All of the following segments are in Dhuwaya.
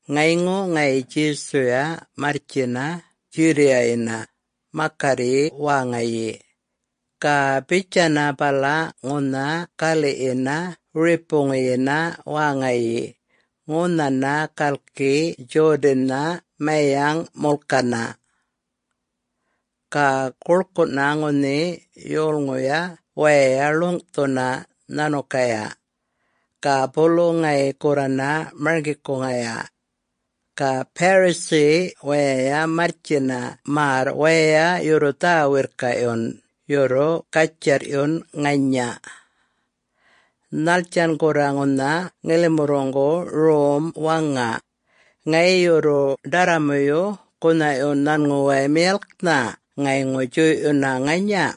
Ŋayŋu ŋayi Djesuya marrtjina Judea-yina makarryi wäŋayi. Ga bitjayana bala ŋunha galiꞌyina wiripuyina wäŋayi ŋunhana galki Jordan-na mayaŋꞌ mulkana. Ga guḻkuꞌna ŋunhi yolŋuya waya ḻuŋꞌthuna nhanukaya. Ga bulu ŋayi gurrana marŋgikuŋaya. Ga Pharisee waya marrtjina märr waya yurru dhä-wirrkaꞌyun yurru gatjarrꞌyun ŋanya, “Nhattjan gurra ŋunha ŋilimuŋguya rom waŋa,... ŋayi yurru ḏarramuyuya gunhaꞌyun nhanŋuway miyalknha ŋayŋu djuyꞌyuna ŋanya?”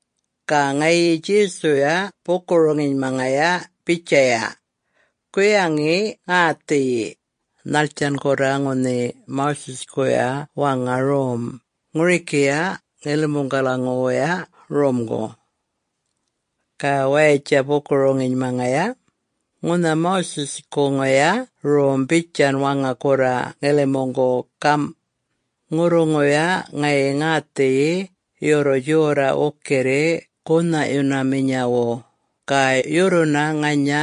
Ga ŋayi Djesuya buku-roŋinymaŋaya bitjaya, “Guyaŋi ŋäthiyi, nhattjan gurra ŋunhi Moses-kuya waŋa rom ŋurikiya ŋilimuŋgalaŋuwuya romgu?” Ga wayatja buku-roŋinymaŋaya, “Ŋunha Moses-kuŋuya rom bitjan waŋa gurra ŋilimuŋgu gamꞌ, Ŋurruŋuya ŋayi ŋäthiyi yurru djorraꞌ wukirri gunhaꞌyunaminyawu, ga yurruna ŋanya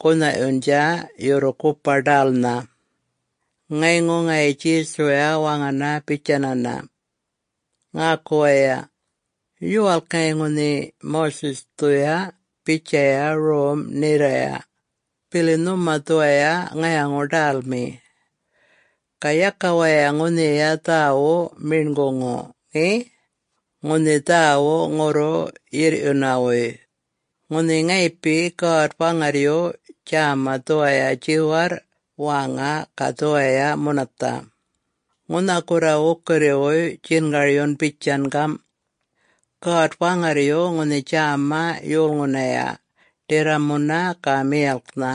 gunhaꞌyundja yurru gupa-ḏälnha.” Ŋayŋu ŋayi Djesuya waŋana bitjayana, “Ŋäku waya! Yuwalk ŋayi ŋunhi Moses-dhuya bitjaya rom nherraya, bili nhuma dhuwaya ŋayaŋu-ḏälmi. Ga yaka waya ŋunhiya dhäwuꞌ meṉguŋu ŋe!, ŋunhi dhäwuꞌ ŋurru-yirrꞌyunawuy, ŋunhi ŋayipi God-Waŋarryu djäma dhuwaya djiwarrꞌ wäŋa ga dhuwaya munathaꞌ! Ŋunha gurra wukirriwuy djingaryun bitjan gamꞌ, ‘God-Waŋarryu ŋunhi djäma yolŋunaya, ḏarramuna ga miyalknha.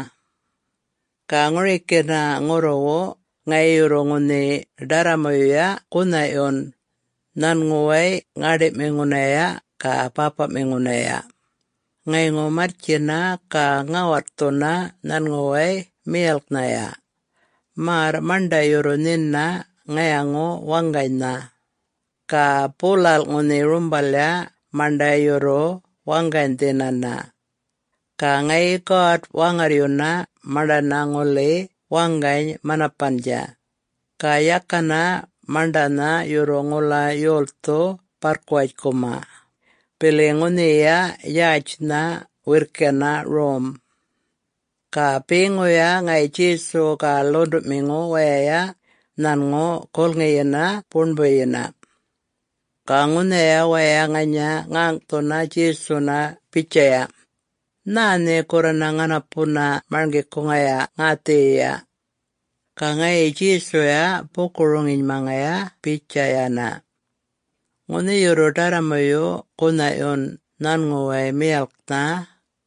Ga ŋurikina ŋurruwu ŋayi yurru ŋunhi ḏarramuyuya gunhaꞌyun nhanŋuway ŋäṉḏiꞌmiŋunaya ga bäpaꞌmiŋunaya, ŋayŋu marrtjina ga ŋätthuna nhanŋuway miyalknhaya, märr maṉḏa yurru nhina ŋayaŋu-waŋganynha, ga bulalꞌ ŋunhi rumbalya maṉḏa yurru waŋganydhinana.’ Ga ŋayi God-Waŋarryuna maṉḏana ŋuli waŋgany-manapandja, ga yakana maṉḏana yurru ŋula yolthu barrkuwatjkuma, bili ŋunhiya yätjnha wirrkina rom!” Ga beŋuya ŋayi Djesu ga ḻuṉḏuꞌmiŋu waya nhanŋu gulŋiyina buṉbuyina. Ga ŋunhaya waya ŋanya ŋäŋꞌthunaya Djesuna bitjaya, “Nhä nhe gurrana ŋanapuna marŋgikuŋaya ŋäthiyiya?” Ga ŋayi Djesuya buku-roŋinymaŋaya bitjayana, “Ŋunhi yurru ḏarramuyu gunhaꞌyun nhanŋuway miyalknha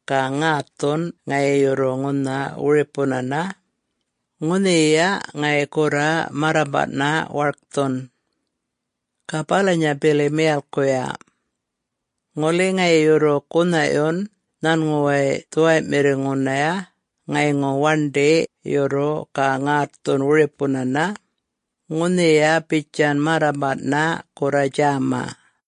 ga ŋätthun ŋayi yurru ŋunha wiripunana, ŋunhiya ŋayi gurra marrambaꞌna warkthun. Ga balanya bili miyalkuya. Ŋuli ŋayi yurru gunhaꞌyun nhanŋuway dhuwayꞌmiŋunaya ŋayŋu waṉḏi yurru ga ŋätthun wiripunana, ŋunhiya bitjan marrambaꞌna gurra djäma.”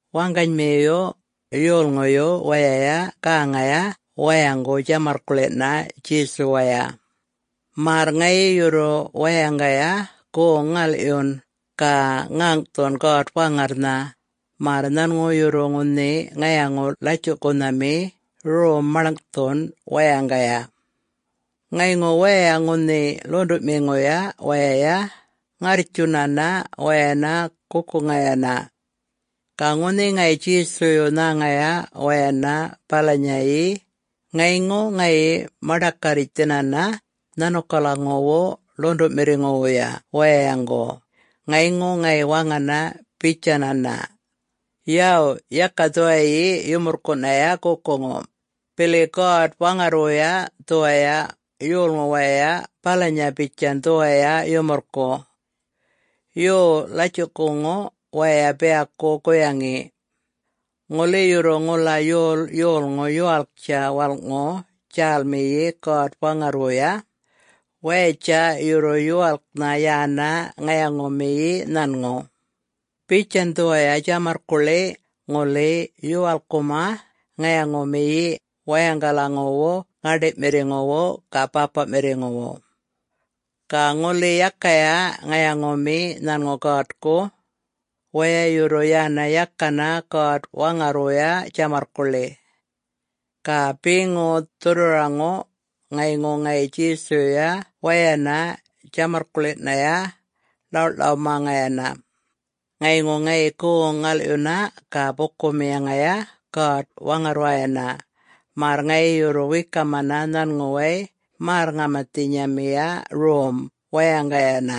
Waŋganymiyu, yolŋuy wayay gäŋaya wayaŋgu djamarrkuḻina Djesuwaya, märr ŋayi yurru wayaŋgaya goŋ-ŋalꞌyun ga ŋäŋꞌthun God-Waŋarrnha märr nhanŋu yurru ŋunhi ŋayaŋu-latjuꞌkunhami rom maḻŋꞌthun wayaŋgaya. Ŋayŋu waya ŋunhi ḻuṉḏuꞌmiŋuya wayay ŋarrtjunana wayana gukuŋayana. Ga ŋunhi ŋayi Djesuyu nhäŋaya wayana balanyayi ŋayŋu ŋayi maḏakarritjthinana nhanukalaŋuwu ḻuṉḏuꞌmiŋuwuya wayaŋgu ŋayŋu ŋayi waŋana bitjayana, “Yaw, yaka dhuwayi yumurrkuꞌnaya gukuŋu, bili God-Waŋarrwuya dhuwaya yolŋu waya balanya bitjan dhuwaya yumurrkuꞌ. Yo, latjuꞌkuŋu waya biyaku guyaŋi. Ŋuli yurru ŋula yol yolŋu yuwalktja walꞌŋu djälmiyi God-Waŋarrwuya, wayatja yurru yuwalknha yana ŋayaŋumiyi nhanŋu, bitjan dhuwaya djamarrkuḻi ŋuli yuwalkkumaya ŋayaŋumiyi wayaŋgalaŋuwu ŋäṉḏiꞌmiŋuwu ga bäpaꞌmiŋuwu. Ga ŋuli yakaya ŋayaŋumiyi nhanŋu Godku, waya yurru yana yakana God-Waŋarrwuya djamarrkuḻi.” Ga beŋu dhurrwaraŋu ŋayŋu ŋayi Djesuyuya wayana djamarrkuḻinaya ḻawꞌḻawmaŋayana, ŋayŋu ŋayi goŋ-ŋalꞌyuna ga bukumiyaŋaya God-Waŋarrwayana märr ŋayi yurru wekamana nhanŋuway märr-ŋamathinyamiya rom wayaŋgayana,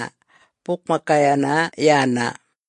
bukmakayana yana.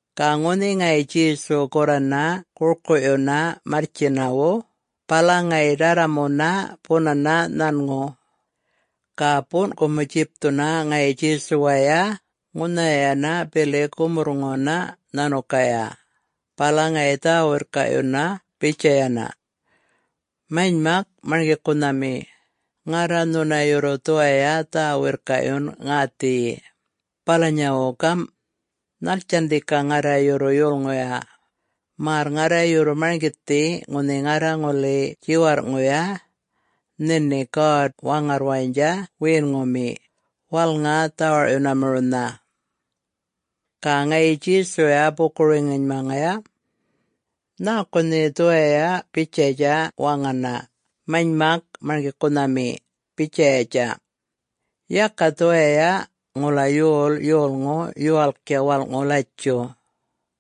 Ga ŋunhi ŋayi Djesu gurrana gurkuꞌyuna marrtjinyawu, bala ŋayi ḏarramuna bunana nhanŋu. Ga buṉꞌkumu djipthuna ŋayi Djesuwaya ŋunhanaya bili gumurrŋuna nhanukaya bala ŋayi dhä-wirrkaꞌyunana bitjayana, “Manymak Marŋgikunhami, ŋarra nhuna yurru dhuwaya dhä-wirrkaꞌyun ŋäthiyi. Balanyawu gamꞌ: Nhattjan dhika ŋarra yurru yulŋuya, märr ŋarra yurru marŋgithi ŋunhi ŋarra ŋuli djiwarrꞌŋuya nhini God-Waŋarrwayatja wiyinŋumi, walŋa-dhawarꞌyunamiriwnha?” Ga ŋayi Djesuya buku-roŋinymaŋaya, “Nhäku nhe dhuwaya bitjayatja waŋana, ‘Manymak Marŋgikunhami’?, bitjayatja. Yaka dhuwaya ŋula yol yolŋu yuwalktja walꞌŋu latjuꞌ,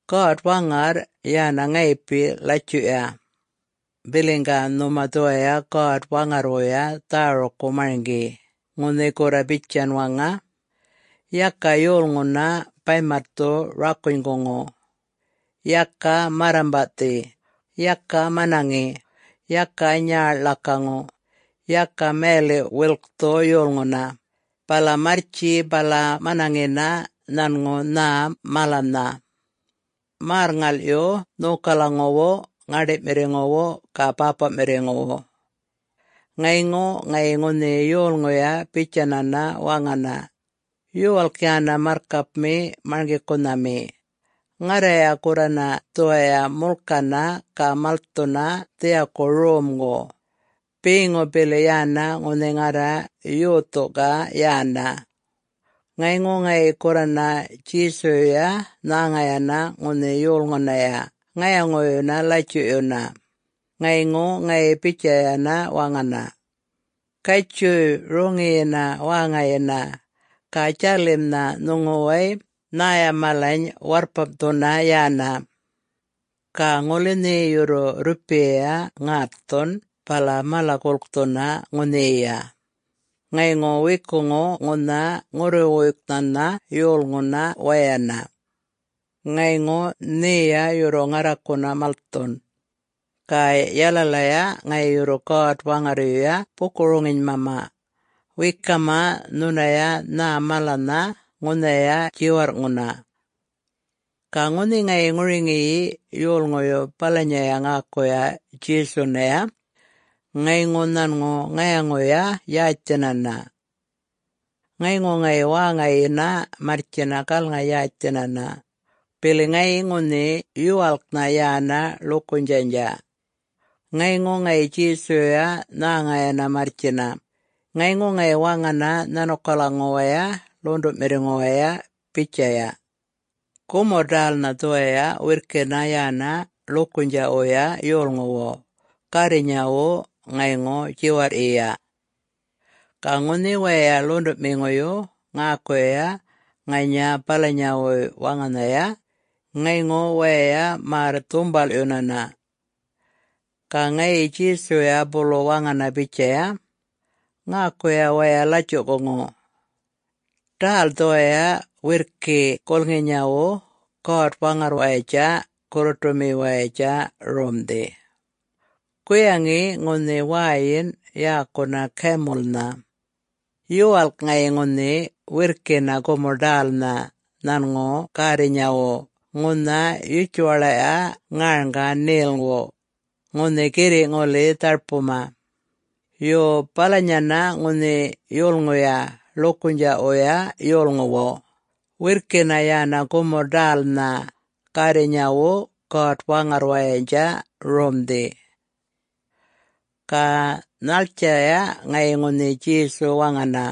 God-Waŋarr yana ŋayipi latjuꞌya. Biliŋga nhuma dhuwaya God-Waŋarrwuya dhärukku marŋgi ŋunhi gurra bitjan waŋa, ‘Yaka yolŋuna baymatthu rakunykuŋu; Yaka marrambaꞌthi; Yaka manaŋi: Yaka nyäḻ ḻakaŋu; Yaka mayaliꞌ-wilkthu yolŋuna, bala marrtji bala manaŋina nhanŋu nhä malanynha; Märr-ŋalꞌyu nhokalaŋuwu ŋäṉḏiꞌmiŋuwu ga bäpaꞌmiŋuwu.’” Ŋayŋu ŋayi ŋunhi yolŋuya bitjayana waŋana, “Yuwalk yana marrkapmi Marŋgikunhami. Ŋarraya gurrana dhuwaya mulkana ga malthuna dhiyaku romgu beŋu bili yana ŋunhi ŋarra yothuŋga yana.” Ŋayŋu ŋayi gurrana Djesuyuya nhäŋayana ŋunhi yolŋunaya ŋayaŋuyuna latjuꞌyuna ŋayŋu ŋayi bitjayana waŋana, “Gatjuy roŋiyina wäŋayina ga djalimnha nhuŋuway nhäya malany warrpamꞌthuna yana. Ga ŋuli nhe yurru rrupiyaya ŋätthun bala mala-gulkthuna ŋunhiya, ŋayŋu wekuŋu ŋunha ŋurruwuyknhana yolŋuna wayana. Ŋayŋu nheya yurru ŋarrakuna malthun. Ga yalalaya ŋayi yurru God-Waŋarryuya buku-roŋinymama wekama nhunaya nhä malanynha ŋunhaya djiwarrꞌŋuna.” Ga ŋunhi ŋayi ŋuriŋi yolŋuyu balanya ŋäkuya Djesunaya, ŋayŋu nhanŋu ŋayaŋuya-yätjthinana. Ŋayŋu ŋayi wäŋayina marrtjina galŋa-yätjthinana, bili ŋayi ŋunhi yuwalknha yana ḻukunydjaꞌya. Ŋayŋu ŋayi Djesuyuya nhäŋayana marrtjina, ŋayŋu ŋayi waŋana nhanukalaŋuwaya ḻuṉḏuꞌmiŋuwaya bitjaya, “Gumurr-ḏälnha dhuwaya wirrkina yana ḻukunydjaꞌwuya yolŋuwu gärrinyawu ŋayŋu djiwarrꞌyiya!” Ga ŋunhi waya ḻuṉḏuꞌmiŋuyu ŋäkuya ŋanya balanyawuy waŋanhaya ŋayŋu waya märr-dhumbalꞌyunana. Ga ŋayi Djesuya bulu waŋana bitjaya, “Ŋäkuya waya latjuꞌkuŋu! Ḏäl dhuwaya wirrki gulŋinyawu God-Waŋarrwayatja gurruṯumiwayatja Romdhi. Guyaŋi ŋunhi wäyina yäkuna camel-nha. Yuwalk ŋayi ŋunhi wirrkina gumurr-ḏälnha nhanŋu gärrinyawu ŋunha yutjuwaḻaꞌya ŋarŋga ṉelŋu, ŋunhi girriꞌ ŋuli dharpuma. Yo, balanyana ŋunhi yulŋuya ḻukunydjaꞌwuya yolŋuwu, wirrkina yana gumurr-ḏälnha gärrinyawu God-Waŋarrwayatja Romdhi.” Ga nhattjaya ŋayi ŋunhi Djesu waŋana,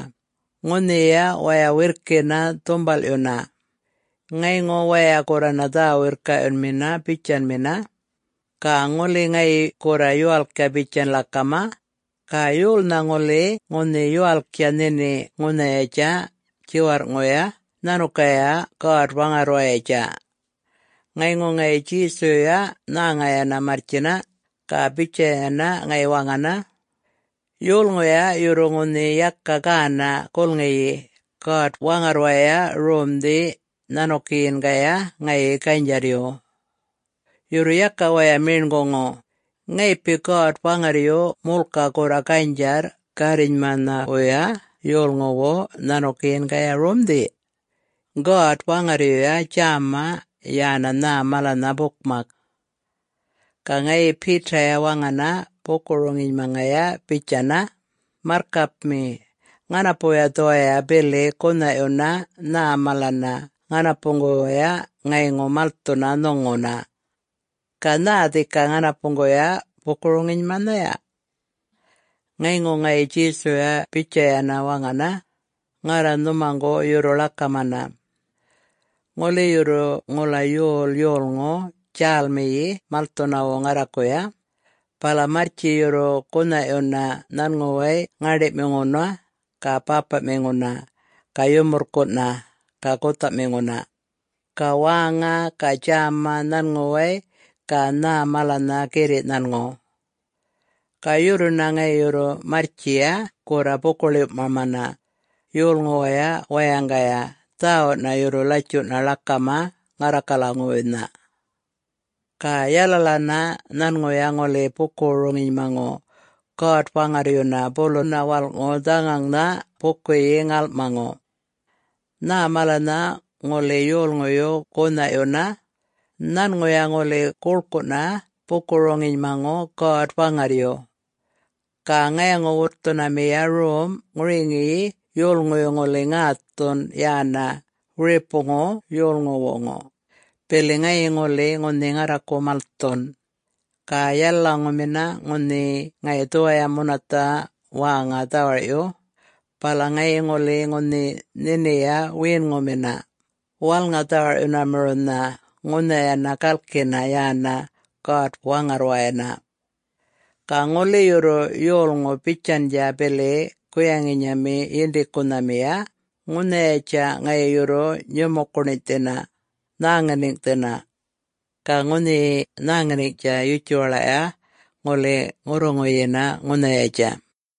ŋunhiya waya wirrkina dhumbalꞌyuna. Ŋayŋu waya gurrana dhä-wirrkaꞌyunmina bitjayana, “Ga, ŋuli ŋayi gurra yuwalktja bitjan ḻakama, ga yolnha ŋuli ŋunhi yuwalktja nhini ŋunhayatja djiwarrꞌŋuya nhanukaya God-Waŋarrwayatja?” Ŋayŋu ŋayi Djesuyuya nhäŋayana marrtjina, ga bitjayana ŋayi waŋana, “Yolŋuya yurru ŋunhi yaka gänaꞌ gulŋiyi God-Waŋarrwaya Romdhi nhanukiyingaya ŋayi ganydjarryu. Yurru yaka waya meṉguŋu, ŋayipi God-Waŋarryu mulka gurra ganydjarr gärrinyamanhawuya yolŋuwu nhanukiyingaya Romdhi. God-Waŋarryuya djäma yana nhä malanynha bukmak.” Ga ŋayi Peter-ya waŋana buku-roŋinymaŋaya bitjana, “Marrkapmi. Ŋanapuya dhuwaya bili gunhaꞌyuna nhä mala ŋanapuŋguway ŋayŋu malthuna nhuŋuna. Ga nhä dhika ŋanapuŋguya buku-roŋinymanhaya?” Ŋayŋu ŋayi Djesuya bitjayana waŋana, “Ŋarra nhumaŋgu yurru ḻakamana! Ŋuli yurru ŋula yol yolŋu djälmiyi malthunawu ŋarrakuya, bala marrtji yurru gunhaꞌyuna nhanŋuway ŋäṉḏiꞌmiŋuna, ga bäpaꞌmiŋuna, ga yumurrkuꞌna, ga guthaꞌmiŋuna, ga wäŋa ga djäma nhanŋuway ga nhä malanynha girriꞌ nhanŋu. Ga yurruna ŋayi yurru marrtjiya gurra buku-ḻiwꞌmamana yolŋuwaya wayaŋgaya dhäwuꞌna yurru latjuꞌna ḻakama ŋarrakalaŋuwuynha. Ga yalalana nhanŋuya ŋuli buku-roŋinymaŋu God-Waŋarryuna buluna walꞌŋu dhaŋaŋnha bukuyi-ŋalꞌmaŋu. Nhä malanynha ŋuli yolŋuyu gunhaꞌyuna, nhanŋuya ŋuli guḻkuꞌna buku-roŋinymaŋu God-Waŋarryu. Ga ŋayaŋu-wutthunamiya rom ŋuriŋi yolŋuyu ŋuli ŋätthun yana wiripuŋu yolŋuwuŋu, bili ŋayi ŋuli ŋunhi ŋarraku malthun. Ga yalalaŋumina ŋunhi ŋayi dhuwaya munathaꞌ wäŋa dhawarꞌyu, bala ŋayi ŋuli ŋunhi nhiniya wiyinŋumina, walŋa-dhawarꞌyunamiriwnha ŋunhayana galkina yana God-Waŋarrwayana. Ga ŋuli yurru yolŋu bitjandja bili guyaŋinyami yindikunhamiya, ŋunhayatja ŋayi yurru nyumukuṉinydhina, nhäŋaniŋꞌthina. Ga ŋunhi nhäŋaniŋꞌtja yutjuwaḻaꞌya ŋuli ŋurruŋuyina ŋunhayatja.”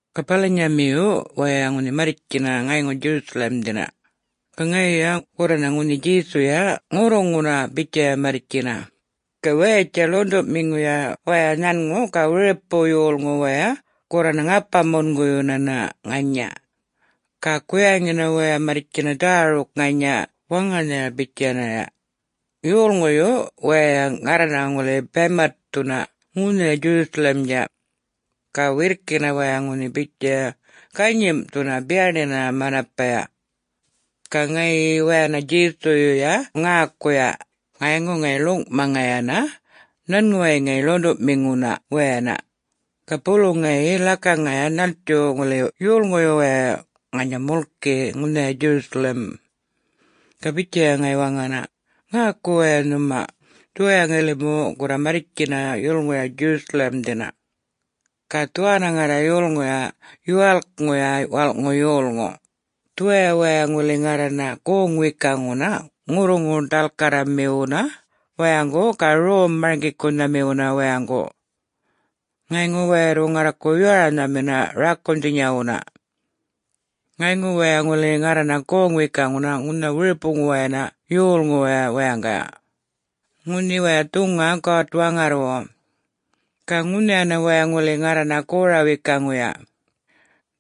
Ga balanyamiyu waya ŋunhi marrtjina ŋayŋu Jerusalem-dhina ga ŋayiya gurrana ŋunhi Djesuya ŋurruŋuna bitjaya marrtjina ga wayatja ḻuṉḏuꞌmiŋuya waya nhanŋu ga wiripu yolŋu waya gurrana ŋapa-munguyunana ŋanya. Ga guyaŋina waya marrtjina dhäruk ŋanya waŋanhaya bitjanaya, “Yolŋuyu wayay ŋarrana ŋuli baymatthuna ŋunhaya Jerusalem-dja.” Ga wirrkina waya ŋunhi bitjaya ganyimꞌthuna, biyaṉina manapaya. Ga ŋayi wayana Djesuyuya ŋäkuya ŋayŋu ŋayi ḻuŋꞌmaŋayana nhanŋuwaya ḻuṉḏuꞌmiŋuna wayana ga bulu ŋayi ḻakaŋaya nhatju ŋuli yolŋuyu wayay ŋanya mulki ŋunhaya Jerusalem. Ga bitjaya ŋayi waŋana, “Ŋäku waya nhuma! Dhuwaya ŋilimu gurra marrtjina yulŋuya Jerusalem-dhina. Ga dhuwanna ŋarra yulŋuya Yuwalkŋuya Walꞌŋu Yolŋu, dhuwaya waya ŋuli ŋarrana goŋ-wekuŋuna ŋurruŋu-ḏalkarramiwuna wayaŋgu ga rom-marŋgikunhamiwuna wayaŋgu. Ŋayŋu waya yurru ŋarraku yoranhamina rakunydhinyawuna. Ŋayŋu waya ŋuli ŋarrana goŋ-wekuŋuna ŋunha wiripuwayana yolŋuwaya wayaŋgaya, ŋunhi waya dhuŋa God-Waŋarrwu. Ga ŋunhayana waya ŋuli ŋarrana gora-wekuŋuya.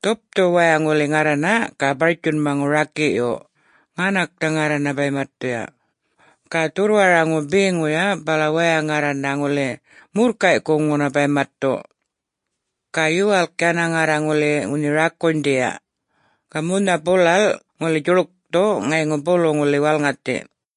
Dhupthuyu waya ŋuli ŋarrana ga bartjunmaŋu rakiꞌyu, ŋanaknha ŋarrana baymatthuya. Ga dhurrwaraŋu beŋuya bala waya ŋarrana ŋuli murrkayꞌkuŋuna baymatthu. Ga yuwalk yana ŋarra ŋuli ŋunhi rakunydhiya, ga munha bulalꞌ ŋuli djuḻkthu ŋayŋu bulu ŋuli walŋathi.”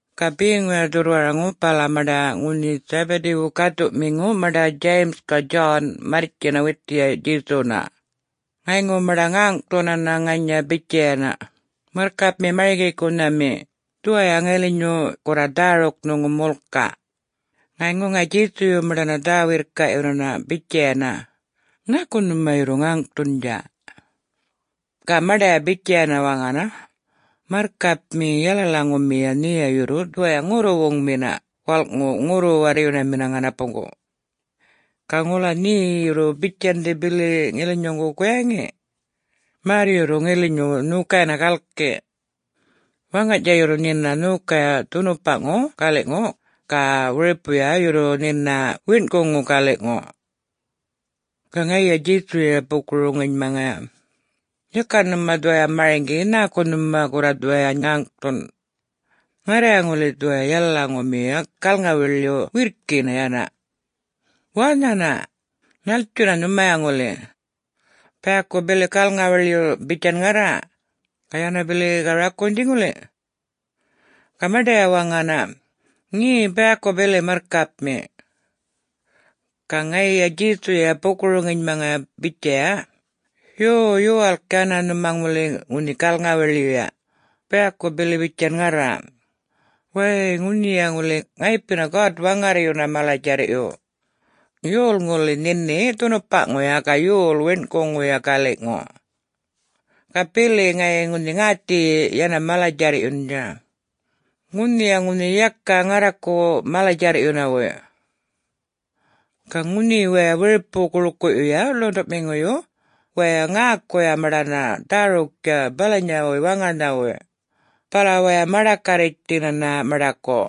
Ga beŋuya dhurrwaraŋu bala maṉḏa ŋunhi Zebedee-wu gäthuꞌmiŋu maṉḏa James ga John marrtjina withiya Djesuna. Ŋayŋu maṉḏa ŋäŋꞌthunana ŋanya bitjayana, “Marrkapmi Marŋgikunhami, dhuwaya ŋilinyu gurra dhäruk nhuŋu mulka.” Ŋayŋu ŋayi Djesuyuya maṉḏana dhä-wirrkaꞌyunana bitjayana, “Nhäku nhuma yurru ŋäŋꞌthundja?” Ga maṉḏaya bitjayana waŋana, “Marrkapmi, yalalamiyuya nheya yurru dhuwaya ŋurruwuŋmina walꞌŋu ŋurru-warryunamina ŋanapuŋgu. Ga ŋula nhe yurru bitjandhi bili ŋilinyuŋguya guyaŋi? Märr yurru ŋilinyu nhokayana galki. Waŋganydja yurru nhina nhokaya dhunupaꞌŋu galiꞌŋu ga wiripuya yurru nhina wiṉꞌkuŋuna galiꞌŋu.” Ga ŋayiya Djesuyuya buku-roŋinymaŋaya, “Yaka nhuma dhuwaya marŋgi nhäku nhuma gurra dhuwaya ŋäŋꞌthun. Ŋarraya ŋuli dhuwaya yalalaŋumiya galŋa-wiḻyuna wirrkina yana. Wanhana? Nhattjuna nhumaya ŋuli... biyaku bili galŋa-wiḻyu bitjan ŋarra, ga yana bili ga rakunydhi ŋuli?” Ga maṉḏaya waŋana, “Ŋe... biyaku bili Marrkapmi.” Ga ŋayiya Djesuyuya buku-roŋinymaŋaya bitjaya, “Yo, yuwalk yana nhuma ŋuli ŋunhi galŋa-wiḻyuya, biyaku bili bitjan ŋarra. Wäy-y, ŋunhiya ŋuli ŋayipina God-Waŋarryuna mala-djarrꞌyu, yol ŋuli nhini dhunupaꞌŋuya ga yol wiṉꞌkuŋuya galiꞌŋu. Ga bili ŋayi ŋunhi ŋäthiyi yana mala-djarrꞌyundja. Ŋunhiya ŋunhi yaka ŋarraku mala-djarrꞌyunawu.” Ga ŋunhi waya wiripu-guḻkuꞌyuya ḻuṉḏuꞌmiŋuyu wayay ŋäkuya maṉḏana dhäruktja balanyawuy waŋanhaya, bala waya maḏakarritjthinana maṉḏaku.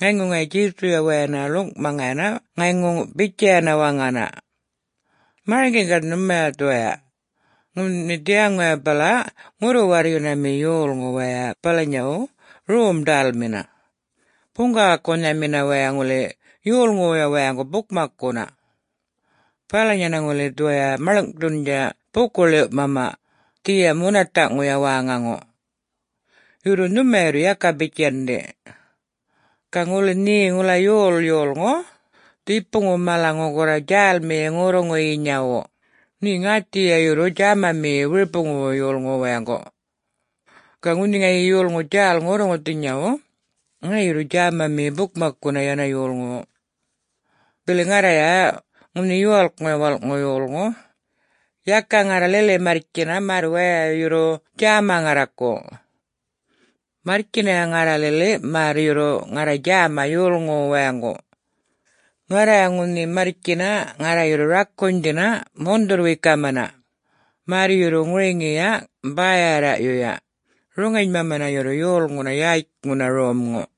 Ŋayŋu ŋayi Djesuyuya wayana ḻuŋꞌmaŋayana ŋayŋu bitjayana waŋana, “Marŋgiŋga nhuma dhuwaya: ŋunhi dhiyaŋuya bala ŋurru-warryunamina yolŋu waya balanyawu, rom-ḏälmina, buŋgawakunhamina waya ŋuli yolŋuwuya wayaŋgu bukmakkuna. Balanyana ŋuli dhuwaya maḻŋꞌthundja buku-ḻiwꞌmama dhiya munathaꞌŋuya wäŋaŋu. Yurru nhumaya yurru yaka bitjandhi. Ga ŋuli nhe ŋula yol yolŋu dhipuŋu malaŋu gurra djälmiyi ŋurruŋuyinyawu, nhe ŋäthiyiya yurru djämamiyi wiripuŋuwu yolŋuwu wayaŋgu. Ga ŋuli ŋayi yolŋu djäl ŋurruŋuthinyawu, ŋayi yurru djämamiyi bukmakkuna yana yolŋuwu. Bili ŋarraya, ŋunhi Yuwalkŋuya Walꞌŋu Yolŋu, yaka ŋarra lili marrtjina märr waya yurru djäma ŋarraku. Marrtjinaya ŋarra lili märr yurru ŋarra djäma yolŋuwu wayaŋgu. Ŋarraya ŋunhi marrtjina ŋarra yurru rakunydhina mundhurr-wekamana, märr yurru ŋuruŋiya bäyarraꞌyuya, roŋinymamana yurru yolŋunana yätjŋuna romŋu.”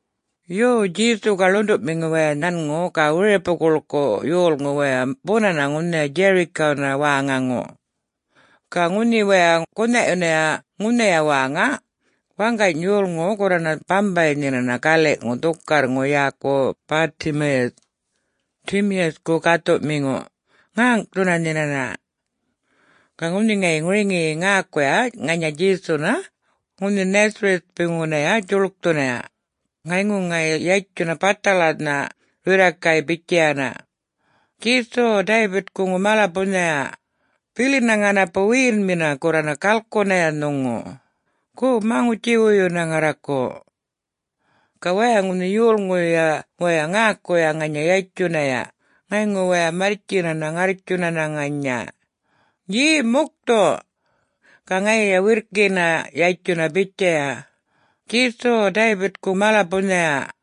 Yo, Djesu ga ḻuṉḏuꞌmiŋu waya nhanŋu ga wiripu guḻkuꞌ yolŋu waya bunana ŋunhaya Jericho-nha wäŋaŋu. Ga ŋunhi waya gunhaꞌyunaya ŋunhiya wäŋaya, waṉgany yolŋu gurrana bambay nhinana galiꞌŋu dhukarrŋu yäku Bartimaeus, Timaus-ku gäthuꞌmiŋu, ŋäŋꞌthuna nhinana. Ga ŋunhi ŋayi ŋuriŋi ŋäkuya ŋanya Djesuna ŋunhi Nazareth-puyŋunaya djuḻkthunaya, ŋayŋu ŋayi yatjunana bathalana rirrakay bitjayana, “Djesu, David-kuŋu mala-bunhaya, bilina ŋanapu wiyinŋumina gurrana galkunaya nhuŋu. Go, maŋutji-wuyuna ŋarraku.” Ga waya ŋunhi yolŋuyuya wayay ŋäkuya ŋanya yatjunaya ŋayŋu waya marrtjinana ŋarrtjunana ŋanya, “Ye,... mukthu!” Ga ŋayiya wirrkina yatjuna bitjaya, “Djesu! David-ku mala-bunhaya,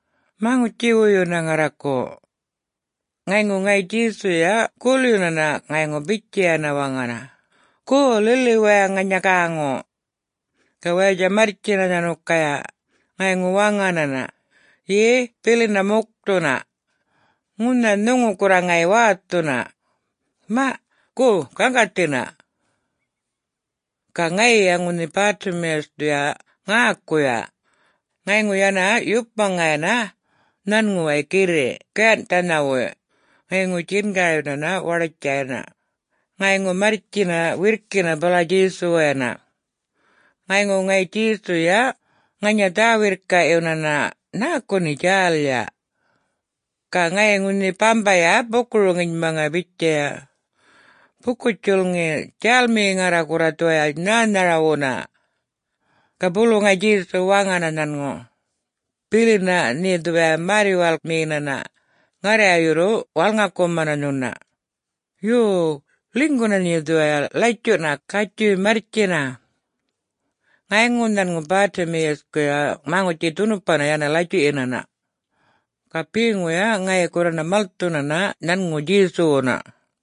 maŋutji-wuyu ŋarraku!” Ŋayŋu ŋayi Djesuya gulyunana ŋayŋu bitjayana waŋana, “Go, lili waya ŋanya gäŋu!” Ga wayatja marrtjina nhanukaya, ŋayŋu waŋanana, “Ye, bilina mukthuna. Ŋunha nhuŋu gurra ŋayi wäthuna. Maꞌ, go, gaŋgathina!” Ga ŋayiya ŋunhi Bartimaeus-thuya ŋäkuya ŋayŋu yana yupmaŋayana nhanŋuway girriꞌ gayanhꞌthanhawuy ŋayŋu djingaryunana waḏutja yana, ŋayŋu marrtjina wirrkina bala Djesuwayana. Ŋayŋu ŋayi Djesuyuya ŋanya dhä-wirrkaꞌyunana, “Nhäku nhe djälya?” Ga ŋayiya ŋunhi bambaya buku-roŋinmaŋaya bitjaya, “Buku-djulŋi, djälmiyi ŋarra gurra dhuwaya nhänharawuna!” Ga bulu ŋayi Djesu waŋana nhanŋu, “Bilina nhe dhuwaya märr-yuwalkmiyinana, ŋarraya yurru walŋakumana nhuna. Yo, ḻinyguna nhe dhuwaya latjuꞌna, gatjuy marrtjina!” Ŋayŋu nhanŋu Bartimaeus-kuya maŋutji dhunupana yana latjuꞌyinana. Ga beŋuya ŋayi gurrana malthunana nhanŋu Djesuwuna.